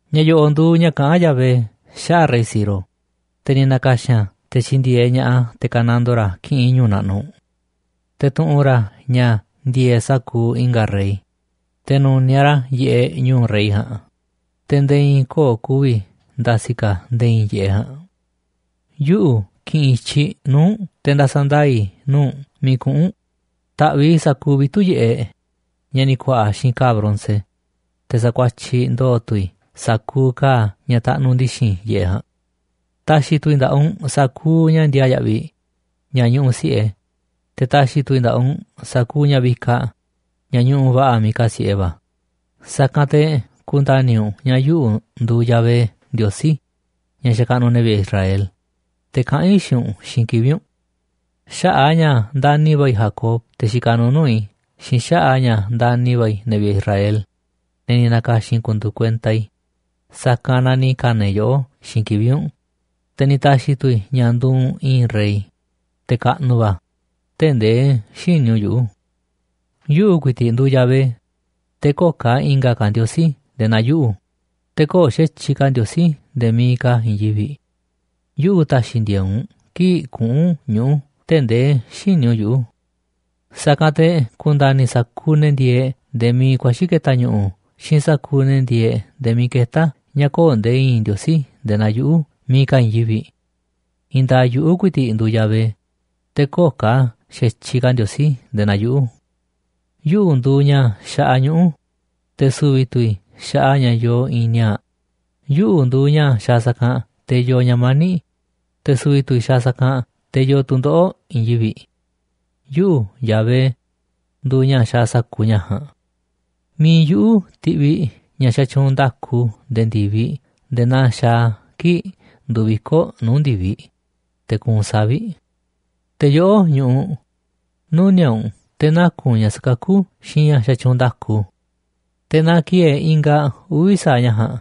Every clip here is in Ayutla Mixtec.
Ña̱ yo̱ꞌo̱ꞌ nduuꞌ ña̱ kaꞌán Yahvé xaꞌa̱ꞌ rey Ciro, te̱ ni̱ na̱ka̱xi̱n a̱ te̱ tyi̱ndi̱e̱eꞌ ña̱ꞌaꞌ a̱ te̱ ka̱nandoo ra̱ kiꞌinꞌ ñu̱u̱ naꞌnuꞌ. Te̱ tu̱ꞌu̱n ra̱ ña̱ ndi̱e̱e̱ꞌ sa̱kuuꞌ i̱nga̱ rey, te̱ nu̱niaꞌ ra̱ yiꞌeꞌ nu̱u̱ rey ja̱a̱nꞌ, te̱ nde̱e̱ i̱i̱n köo̱ꞌ ku̱vi̱ nda̱si̱ ka̱ nde̱e̱ i̱i̱n yiꞌeꞌ ja̱a̱nꞌ. “Yuꞌu̱ ki̱ꞌi̱n i̱tyiꞌ nuu̱ꞌ u̱nꞌ te̱ nda̱sa̱ ndaa̱ i̱ i̱tyiꞌ nuu̱ꞌ u̱nꞌ miiꞌ kuꞌu̱n u̱nꞌ. Ta̱ꞌviꞌ i̱ sa̱kuuꞌ vitu̱ꞌ yiꞌeꞌ ña̱ ni̱ ku̱a̱ꞌa̱ xiinꞌ ka̱a̱ bronce, te̱ sa̱kuatyiꞌ ndo̱o̱ tu̱ i̱ sa̱kuuꞌ ka̱a̱ ña̱ taꞌnuꞌ ndi̱xi̱n yiꞌeꞌ ja̱a̱nꞌ. Ta̱xi̱ tu̱ i̱ nda̱ꞌaꞌ u̱nꞌ sa̱kuuꞌ ña̱ ndiaa yaꞌviꞌ ña̱ ñuꞌuꞌ si̱ꞌe, te̱ ta̱xi̱ tu̱ i̱ nda̱ꞌaꞌ u̱nꞌ sa̱kuuꞌ ña̱ vikaꞌ ña̱ ñuꞌuꞌ va̱ꞌa̱ miiꞌ kasi̱ꞌe va̱. Sa̱kanꞌ te̱ ku̱nda̱ni̱ u̱nꞌ ña̱ yuꞌu̱ nduuꞌ Yahvé Ndiosí, ña̱ xakaꞌnuꞌ ne̱ vi̱ꞌe̱ Israel, te̱ kaꞌán i̱ xiinꞌ u̱nꞌ xiinꞌ kivi̱ꞌ u̱nꞌ. Xaꞌa̱ꞌ a̱ ña̱ ndani̱ va̱ i̱ Jacob, te̱ xikaꞌ nuuꞌ nuu̱ꞌ i̱, xiinꞌ xaꞌa̱ꞌ a̱ ña̱ ndani̱ va̱ i̱ ne̱ vi̱ꞌe̱ Israel, ne̱ ni̱ na̱ka̱xi̱n i̱ ku̱ndu̱u̱ kuenta i̱, sa̱kanꞌ na ni̱ ka̱na̱ i̱ yoꞌó xiinꞌ kivi̱ꞌ u̱nꞌ, te̱ ni̱ ta̱xi̱ tu̱ i̱ ña̱ nduuꞌ u̱nꞌ i̱i̱n rey, te̱ kaꞌnuꞌ va̱, tee̱ꞌ ndee xïní u̱nꞌ yuꞌu̱. Yuꞌu̱ ku̱i̱ti̱ꞌ nduuꞌ Yahvé, te̱ köo̱ꞌ ka̱ i̱nga̱ ka̱ ndiosí nde̱e̱ naa yuꞌu̱, te̱ köo̱ꞌ xa̱tyiꞌ ka̱ Ndiosí nde̱e̱ miiꞌ ka̱ i̱i̱n yivi̱ꞌ. Yuꞌu̱ ta̱xi̱ ndi̱e̱e̱ꞌ u̱nꞌ kii̱ꞌ kuꞌu̱n ñuꞌu̱ tee̱ꞌ ndee xïní u̱nꞌ yuꞌu̱. Sa̱kanꞌ te̱ ku̱nda̱ni̱ sa̱kuuꞌ ne̱ ndieeꞌ nde̱e̱ miiꞌ ku̱a̱xi̱ ke̱ta̱ ñu̱ꞌu̱ xiinꞌ sa̱kuuꞌ ne̱ ndieeꞌ nde̱e̱ miiꞌ ketá a̱ ña̱ köo̱ꞌ nde̱e̱ i̱i̱n Ndiosí nde̱e̱ naa yuꞌu̱ miiꞌ ka̱ i̱i̱n yivi̱ꞌ. I̱i̱n nda̱a̱ꞌ yuꞌu̱ ku̱i̱ti̱ꞌ nduuꞌ Yahvé, te̱ köo̱ꞌ ka̱ xa̱tyiꞌ ka̱ ndiosí nde̱e̱ naa yuꞌu̱. Yuꞌu̱ nduuꞌ ña̱ xaꞌa ñuꞌu̱, te̱ su̱vi̱ tu̱ i̱ xaꞌa ña̱ yoo i̱i̱n ni̱a̱a̱ꞌ. Yuꞌu̱ nduuꞌ ña̱ xaaꞌ sa̱kanꞌ te̱ yoo ña̱ mani̱ꞌ, te̱ su̱vi̱ tu̱ i̱ xaaꞌ sa̱kanꞌ te̱ yoo tu̱ndoꞌo̱ꞌ i̱i̱n yivi̱ꞌ. Yuꞌu̱, Yahvé, nduuꞌ ña̱ xaaꞌ sa̱kuuꞌ ña̱ ja̱a̱nꞌ. ’Mi̱iꞌ yuꞌu̱ ti̱ꞌviꞌ ña̱ xatyuunꞌ nda̱ku nde̱e̱ ndi̱viꞌ nde̱e̱ naa xaaꞌ a̱ kii̱ꞌ nduuꞌ viko̱ꞌ nuu̱ꞌ ndi̱viꞌ, te̱ kuunꞌ savi̱ꞌ. Te̱ yoꞌó ñu̱ꞌuꞌ, nuni̱a̱ꞌ u̱nꞌ te̱ naku̱n ña̱ sakakú xiinꞌ ña̱ xatyuunꞌ nda̱ku. Te̱ na ki̱e̱e̱ ingaꞌ uvi̱ sa̱aꞌ ña̱ ja̱a̱nꞌ.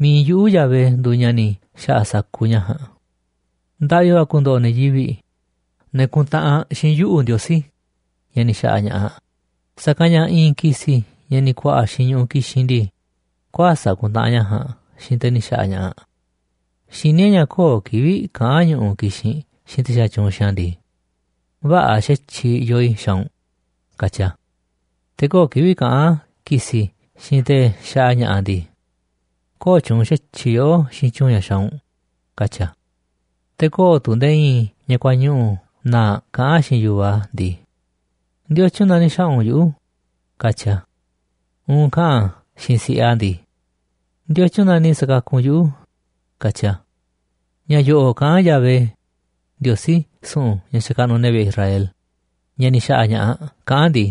Mi̱iꞌ yuꞌu̱ Yahvé nduuꞌ ña̱ ni̱ xa̱ꞌa̱ sa̱kuuꞌ ña̱ ja̱a̱nꞌ. Ndaꞌvi va̱ ku̱ndo̱ꞌo̱ ne̱ yivi̱ꞌ, ne̱ kuntaꞌanꞌ xiinꞌ Ndiosí, ña̱ ni̱ xa̱ꞌa̱ ña̱ꞌaꞌ, sa̱kanꞌ ña̱ i̱i̱n ki̱si̱ ña̱ ni̱ ku̱a̱ꞌa̱ xiinꞌ ñu̱ꞌuꞌ kixinꞌ ndii, kuäsa̱ꞌ kuntaꞌanꞌ ña̱ ja̱a̱nꞌ xiinꞌ te̱ ni̱ xa̱ꞌa̱ ña̱ꞌaꞌ. Xiní e̱ꞌ ña̱ köo̱ꞌ kivi̱ꞌ kaꞌán ñu̱ꞌuꞌ kixinꞌ xiinꞌ te̱ xatyuunꞌ xiinꞌ a̱ ndii: Vä̱ꞌa̱ xa̱tyiꞌ yoo i̱ xaaꞌ u̱nꞌ, katyi a̱. ’Te̱ köo̱ꞌ kivi̱ꞌ kaꞌán ki̱si̱ xiinꞌ te̱ xaꞌa ña̱ꞌaꞌ ndii: Köo̱ꞌ tyuunꞌ xa̱tyiꞌ yoꞌó xiinꞌ tyu̱u̱n ña̱ xaaꞌ u̱nꞌ, katyi a̱. Te̱ köo̱ꞌ tu̱ nde̱e̱ i̱i̱n ña̱ kuañuꞌu̱ na̱a̱ꞌ kaꞌán xiinꞌ yu̱vaꞌ a̱ ndii: ¿Ndiotyun na ni̱ xa̱ꞌa̱ u̱nꞌ yuꞌu̱?, katyi a̱. Uun kaꞌa̱n a̱ xiinꞌ si̱ꞌiꞌ a̱ ndii: ¿Ndiotyun na ni̱ sa̱kakuꞌ u̱nꞌ yuꞌu̱?, katyi a̱.” Ña̱ yoꞌoꞌ kaꞌán Yahvé, Ndiosí su̱ꞌu̱n ña̱ xakaꞌnuꞌ ne̱ vi̱ꞌe̱ e̱ Israel, ña̱ ni̱ xa̱ꞌa̱ ña̱ꞌaꞌ, kaꞌán a̱ ndii: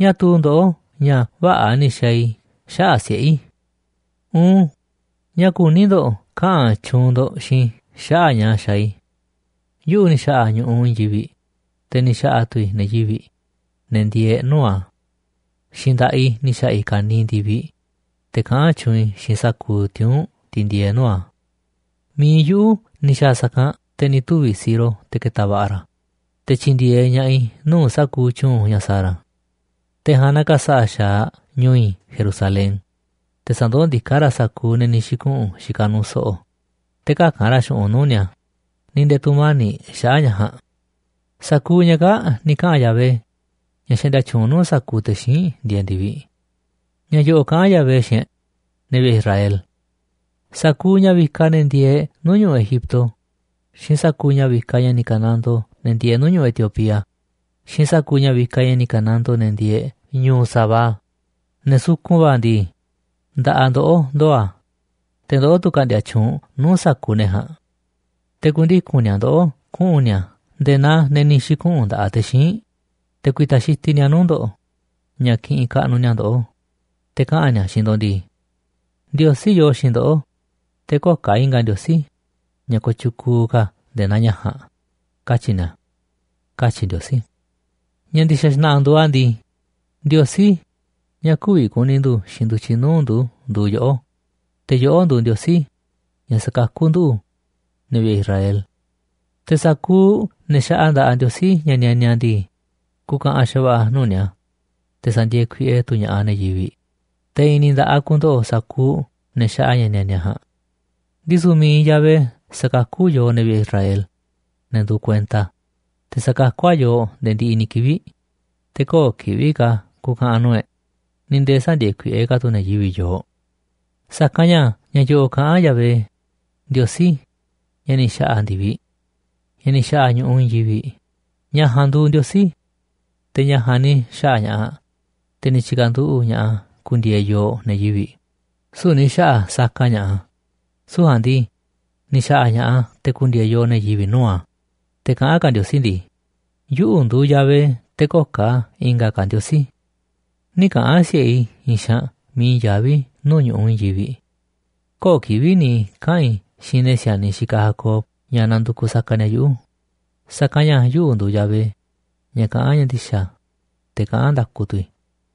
“¿Ñáá tuu ndoꞌó ña̱ vä̱ꞌa̱ ni̱ xaaꞌ i̱ xaꞌa̱ꞌ siꞌe̱ i̱? Uun, ¿ñáá kuní ndo̱ꞌ kaꞌa̱n tyuunꞌ ndo̱ꞌ xiinꞌ i̱ xaꞌa̱ꞌ ña̱ xaaꞌ i̱? Yuꞌu̱ ni̱ xa̱ꞌa̱ ñu̱ꞌuꞌ i̱i̱n yivi̱ꞌ, te̱ ni̱ xa̱ꞌa̱ tu̱ i̱ ne̱ yivi̱ꞌ, ne̱ ndieeꞌ nuu̱ꞌ a̱. Xiinꞌ nda̱ꞌaꞌ i̱ ni̱ xa̱ꞌa̱ i̱ ka̱niiꞌ ndi̱viꞌ, te̱ kaꞌán tyuunꞌ i̱ xiinꞌ sa̱kuuꞌ tiuu̱nꞌ tiꞌ ndieeꞌ nuu̱ꞌ a̱. Mi̱iꞌ yuꞌu̱ ni̱ xa̱a̱ sa̱kanꞌ te̱ ni̱ tuvi̱ Ciro te̱ ke̱ta̱ va̱ꞌa̱ ra̱, te̱ tyi̱ndi̱e̱eꞌ ña̱ꞌaꞌ i̱ nuu̱ꞌ sa̱kuuꞌ tyu̱u̱n ña̱ sa̱a̱ ra̱. Te̱ ja̱a̱nꞌ na̱ka̱sa̱ꞌa̱ xa̱aꞌ ñu̱u̱ i̱ Jerusalén, te̱ sa̱ndoó ndiká ra̱ sa̱kuuꞌ ne̱ ni̱ xi̱kuꞌu̱n xikaꞌ nuuꞌ so̱ꞌo̱, te̱ käka̱n ra̱ xu̱ꞌunꞌ nuu̱ꞌ ni̱a̱ ni̱ nde̱e̱ tu̱mani̱ꞌ xaꞌa̱ꞌ ña̱ ja̱a̱nꞌ.” Sa̱kuuꞌ ña̱ kaa̱ꞌ ni̱ kaꞌa̱n Yahvé, ña̱ xaꞌndia tyuunꞌ nuu̱ꞌ sa̱kuuꞌ te̱ xíinꞌ ndieeꞌ ndi̱viꞌ. Ña̱ yo̱ꞌo̱ꞌ kaꞌán Yahvé xiinꞌ e̱ꞌ, ne̱ vi̱ꞌe̱ Israel: “Sa̱kuuꞌ ña̱ vikaꞌ ne̱ ndieeꞌ nuu̱ꞌ ñu̱ꞌuꞌ Egipto, xiinꞌ sa̱kuuꞌ ña̱ vikaꞌ ña̱ ni̱ ka̱nandoo ne̱ ndieeꞌ nuu̱ꞌ ñu̱ꞌuꞌ Etiopía, xiinꞌ sa̱kuuꞌ ña̱ vikaꞌ ña̱ ni̱ ka̱nandoo ne̱ ndieeꞌ nuu̱ꞌ ñu̱ꞌuꞌ Sabá, ne̱ sukun va̱ ndii, nda̱ꞌaꞌ ndoꞌó ndoo̱ a̱, te̱ ndoꞌó tu̱ ka̱ꞌndi̱a̱ tyuunꞌ nuu̱ꞌ sa̱kuuꞌ ne̱ ja̱a̱nꞌ. Te̱ ku̱ndiku̱n ni̱a̱ ndoꞌó kuꞌu̱n ni̱a̱ nde̱e̱ naa ne̱ ni̱ xi̱kuꞌu̱n nda̱ꞌaꞌ te̱ xíinꞌ, te̱ ku̱i̱ta̱ xitiꞌ ni̱a̱ nuu̱ꞌ ndo̱ꞌ ña̱ kiꞌinꞌ kaꞌnuꞌ ni̱a̱ ndoꞌó, te̱ kaꞌa̱n ni̱a̱ xiinꞌ ndo̱ꞌ ndii: Ndiosí yoo xiinꞌ ndoꞌó, te̱ köo̱ꞌ ka̱ i̱nga̱ ndiosí, ña̱ kooꞌ tyukuuꞌ ka̱ nde̱e̱ naa ña̱ ja̱a̱nꞌ, katyi̱ ni̱a̱”, katyi̱ Ndiosí. Ña̱ ndi̱xa̱ xna̱ꞌa̱ nduuꞌ a̱ ndii, Ndiosí, ña̱ kü̱vi̱ ku̱ni̱ ndu̱ xiinꞌ ndu̱tyiꞌ nuu̱ꞌ ndu̱ nduuꞌ yoꞌó, te̱ yoꞌó nduuꞌ Ndiosí, ña̱ sa̱kakú nduꞌu̱, ne̱ vi̱ꞌe̱ Israel. Te̱ sa̱kuuꞌ ne̱ xaꞌa nda̱ꞌaꞌ ndiosí, ña̱ nianiaꞌ ndii, ku̱ka̱ꞌa̱n xa̱va̱ꞌa̱ nuu̱ꞌ ni̱a̱, te̱ sa̱ndi̱e̱e̱ kuiꞌe tu̱ ña̱ꞌaꞌ ne̱ yivi̱ꞌ. Te̱ i̱i̱n ni̱ nda̱ꞌaꞌ ku̱ndo̱ꞌo̱ sa̱kuuꞌ ne̱ xaꞌa ña̱ nianiaꞌ ja̱a̱nꞌ. Ndisu̱ mi̱iꞌ Yahvé sa̱kakú yooꞌ, ne̱ vi̱ꞌe̱ Israel, ne̱ nduuꞌ kuenta a̱, te̱ sa̱kakú a̱ yooꞌ nde̱e̱ ndiꞌiꞌ ni̱ kivi̱ꞌ, te̱ köo̱ꞌ kivi̱ꞌ ka̱ ku̱ka̱ꞌa̱n nuu̱ꞌ e̱ꞌ, ni̱ nde̱e̱ sä̱ndi̱e̱e̱ kuiꞌe ka̱ tu̱ ne̱ yivi̱ꞌ yooꞌ. Sa̱kanꞌ ña̱ ña̱ yo̱ꞌo̱ꞌ kaꞌán Yahvé, Ndiosí ña̱ ni̱ xa̱ꞌa̱ ndi̱viꞌ. Ña̱ ni̱ xa̱ꞌa̱ ñu̱ꞌuꞌ i̱i̱n yivi̱ꞌ, ña̱ ja̱a̱nꞌ nduu Ndiosí. Te̱ ña̱ ja̱a̱nꞌ ni̱ xa̱ꞌa̱ ña̱ꞌaꞌ, te̱ ni̱ tyi̱ka̱nduꞌu̱ꞌ ña̱ꞌaꞌ a̱ ku̱ndi̱e̱e̱ yooꞌ ne̱ yivi̱ꞌ, süu̱ꞌ ni̱ xa̱ꞌa̱ saka ña̱ꞌaꞌ a̱. Süu̱ꞌ ja̱a̱nꞌ ndii, ni̱ xa̱ꞌa̱ ña̱ꞌaꞌ a̱ te̱ ku̱ndi̱e̱e̱ yooꞌ ne̱ yivi̱ꞌ nuu̱ꞌ a̱. Te̱ kaꞌán ka̱ Ndiosí ndii: “Yuꞌu̱ nduuꞌ Yahvé, te̱ köo̱ꞌ i̱nga̱ ka̱ ndiosí. Nï̱ kaꞌa̱n si̱ꞌe i̱ i̱i̱n xaanꞌ miiꞌ i̱i̱n yaví nuu̱ꞌ ñu̱ꞌuꞌ i̱i̱n yivi̱ꞌ, köo̱ꞌ kivi̱ꞌ ni̱ kaꞌa̱n i̱ xiinꞌ ne̱ si̱a̱niꞌ xikaꞌ Jacob ña̱ nandukuꞌ saka ni̱a̱ yuꞌu̱. Sa̱kanꞌ ña̱ yuꞌu̱ nduuꞌ Yahvé, ña̱ kaꞌán ña̱ ndi̱xa̱, te̱ kaꞌán nda̱ku tu̱ i̱.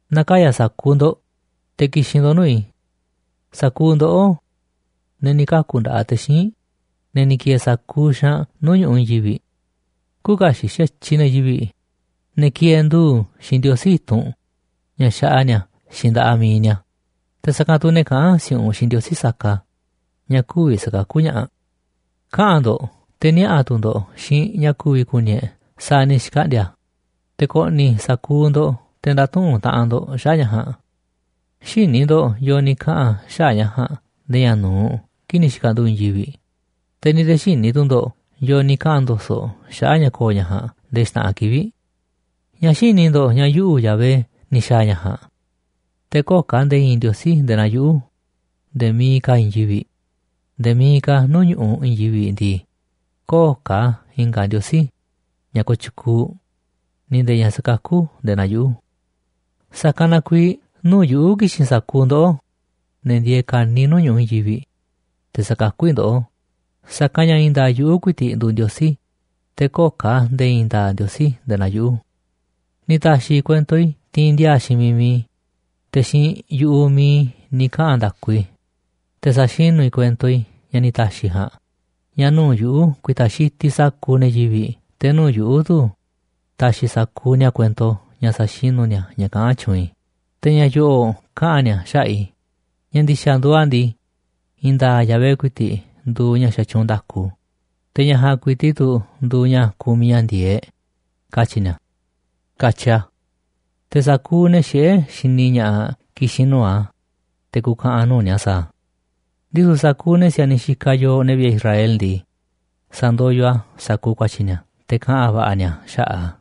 ’Na̱kaya̱ sa̱kuuꞌ ndo̱ꞌ, te̱ ki̱xi̱n ndo̱ꞌ nuu̱ꞌ i̱. Sa̱kuuꞌ ndoꞌó, ne̱ ni̱ kaku̱ nda̱ꞌaꞌ te̱ xíinꞌ, ne̱ ni̱ ki̱e̱e̱ sa̱kuuꞌ xaanꞌ nuu̱ꞌ ñu̱ꞌuꞌ i̱i̱n yivi̱ꞌ. Küuꞌ kaxiꞌ xa̱tyiꞌ ne̱ yivi̱ꞌ, ne̱ kieeꞌ ndu̱u̱ xiinꞌ ndiosí i̱tunꞌ ña̱ xaꞌa ni̱a̱ xiinꞌ nda̱ꞌaꞌ mi̱iꞌ ni̱a̱, te̱ sa̱kanꞌ tu̱ ne̱ kaꞌán si̱u̱ꞌunꞌ xiinꞌ ndiosí saka ña̱ kü̱vi̱ sa̱kakú ña̱ꞌaꞌ. Kaꞌa̱n ndo̱ꞌ, te̱ niaꞌa̱ tu̱ ndo̱ꞌ xiinꞌ ña̱ ku̱vi̱ ku̱ni̱ e̱ꞌ sa̱a̱ ni̱ xkaꞌndi̱a̱ a̱. Te̱ ko̱ꞌni̱ sa̱kuuꞌ ndo̱ꞌ te̱ nda̱tuꞌu̱nꞌ taꞌanꞌ ndo̱ꞌ xaꞌa̱ꞌ ña̱ ja̱a̱nꞌ. Xïní ndo̱ꞌ yo̱o̱ ni̱ kaꞌa̱n xaꞌa̱ꞌ ña̱ ja̱a̱nꞌ nde̱e̱ ña̱ nu̱uꞌ kii̱ꞌ ni̱ xi̱ka̱nduꞌu̱ꞌ i̱i̱n yivi̱ꞌ, te̱ ni̱ nde̱e̱ xïní tu̱ ndo̱ꞌ yo̱o̱ ni̱ kaꞌa̱n ndo̱so̱ꞌ xaꞌa̱ꞌ ña̱ ko̱o̱ ña̱ ja̱a̱nꞌ nde̱e̱ xta̱ꞌanꞌ kivi̱ꞌ. ¿Ñáá xïní ndo̱ꞌ ña̱ yuꞌu̱, Yahvé, ni̱ xa̱a̱ ña̱ ja̱a̱nꞌ? Te̱ köo̱ꞌ ka̱ nde̱e̱ i̱i̱n Ndiosí nde̱e̱ naa yuꞌu̱, nde̱e̱ miiꞌ ka̱ i̱i̱n yivi̱ꞌ, nde̱e̱ miiꞌ ka̱ nuu̱ꞌ ñu̱ꞌuꞌ i̱i̱n yivi̱ꞌ ndii. Köo̱ꞌ ka̱ i̱nga̱ Ndiosí ña̱ kooꞌ tyukuuꞌ ni̱ nde̱e̱ ña̱ sakakú nde̱e̱ naa yuꞌu̱. ’Sa̱kanꞌ na kuiiꞌ nuu̱ꞌ yuꞌu̱ ki̱xi̱n sa̱kuuꞌ ndoꞌó, ne̱ ndieeꞌ ka̱niiꞌ nuu̱ꞌ ñu̱ꞌuꞌ i̱i̱n yivi̱ꞌ, te̱ sa̱kakú i̱ ndoꞌó. Sa̱kanꞌ ña̱ i̱i̱n nda̱a̱ꞌ yuꞌu̱ ku̱i̱ti̱ꞌ nduuꞌ Ndiosí, te̱ köo̱ꞌ ka̱ nde̱e̱ i̱i̱n nda̱a̱ꞌ Ndiosí nde̱e̱ naa yuꞌu̱. Ni̱ ta̱xi̱ i̱ kuento i̱ tiinꞌ ndiaa xiinꞌ miiꞌ mi̱iꞌ i̱, te̱ xiinꞌ yu̱ꞌuꞌ mi̱iꞌ ni̱ kaꞌa̱n nda̱ku i̱, te̱ sa̱xinu̱ i̱ kuento i̱ ña̱ ni̱ ta̱xi̱ ja̱a̱nꞌ ña̱ nuu̱ꞌ yuꞌu̱ ku̱i̱ta̱ xitiꞌ sa̱kuuꞌ ne̱ yivi̱ꞌ, te̱ nuu̱ꞌ yuꞌu̱ tu̱ ta̱xi̱ sa̱kuuꞌ ni̱a̱ kuento ña̱ sa̱xinu̱ ni̱a̱ ña̱ kaꞌán tyuunꞌ i̱. Te̱ ña̱ yo̱ꞌo̱ꞌ kaꞌa̱n ni̱a̱ xaꞌa̱ꞌ i̱: Ña̱ ndi̱xa̱ nduuꞌ a̱ ndii, i̱i̱n nda̱a̱ꞌ Yahvé ku̱i̱ti̱ꞌ nduuꞌ ña̱ xatyuunꞌ nda̱ku, te̱ ña̱ ja̱a̱nꞌ ku̱i̱ti̱ꞌ tu̱ nduuꞌ ña̱ kumiꞌ ña̱ ndi̱e̱eꞌ, katyi̱ ni̱a̱”, katyi a̱. Te̱ sa̱kuuꞌ ne̱ xiꞌé xini ña̱ꞌaꞌ ki̱xi̱n nuu̱ꞌ a̱, te̱ ku̱ka̱ꞌa̱n nuu̱ꞌ ni̱a̱ sa̱a̱ a̱. Ndisu̱ sa̱kuuꞌ ne̱ si̱a̱niꞌ xikaꞌ yooꞌ, ne̱ vi̱ꞌe̱ Israel ndii, sa̱ndoyoꞌ a̱ sa̱kuuꞌ ku̱a̱tyi̱ ni̱a̱, te̱ kaꞌa̱n va̱ꞌa̱ ni̱a̱ xaꞌa̱ꞌ a̱.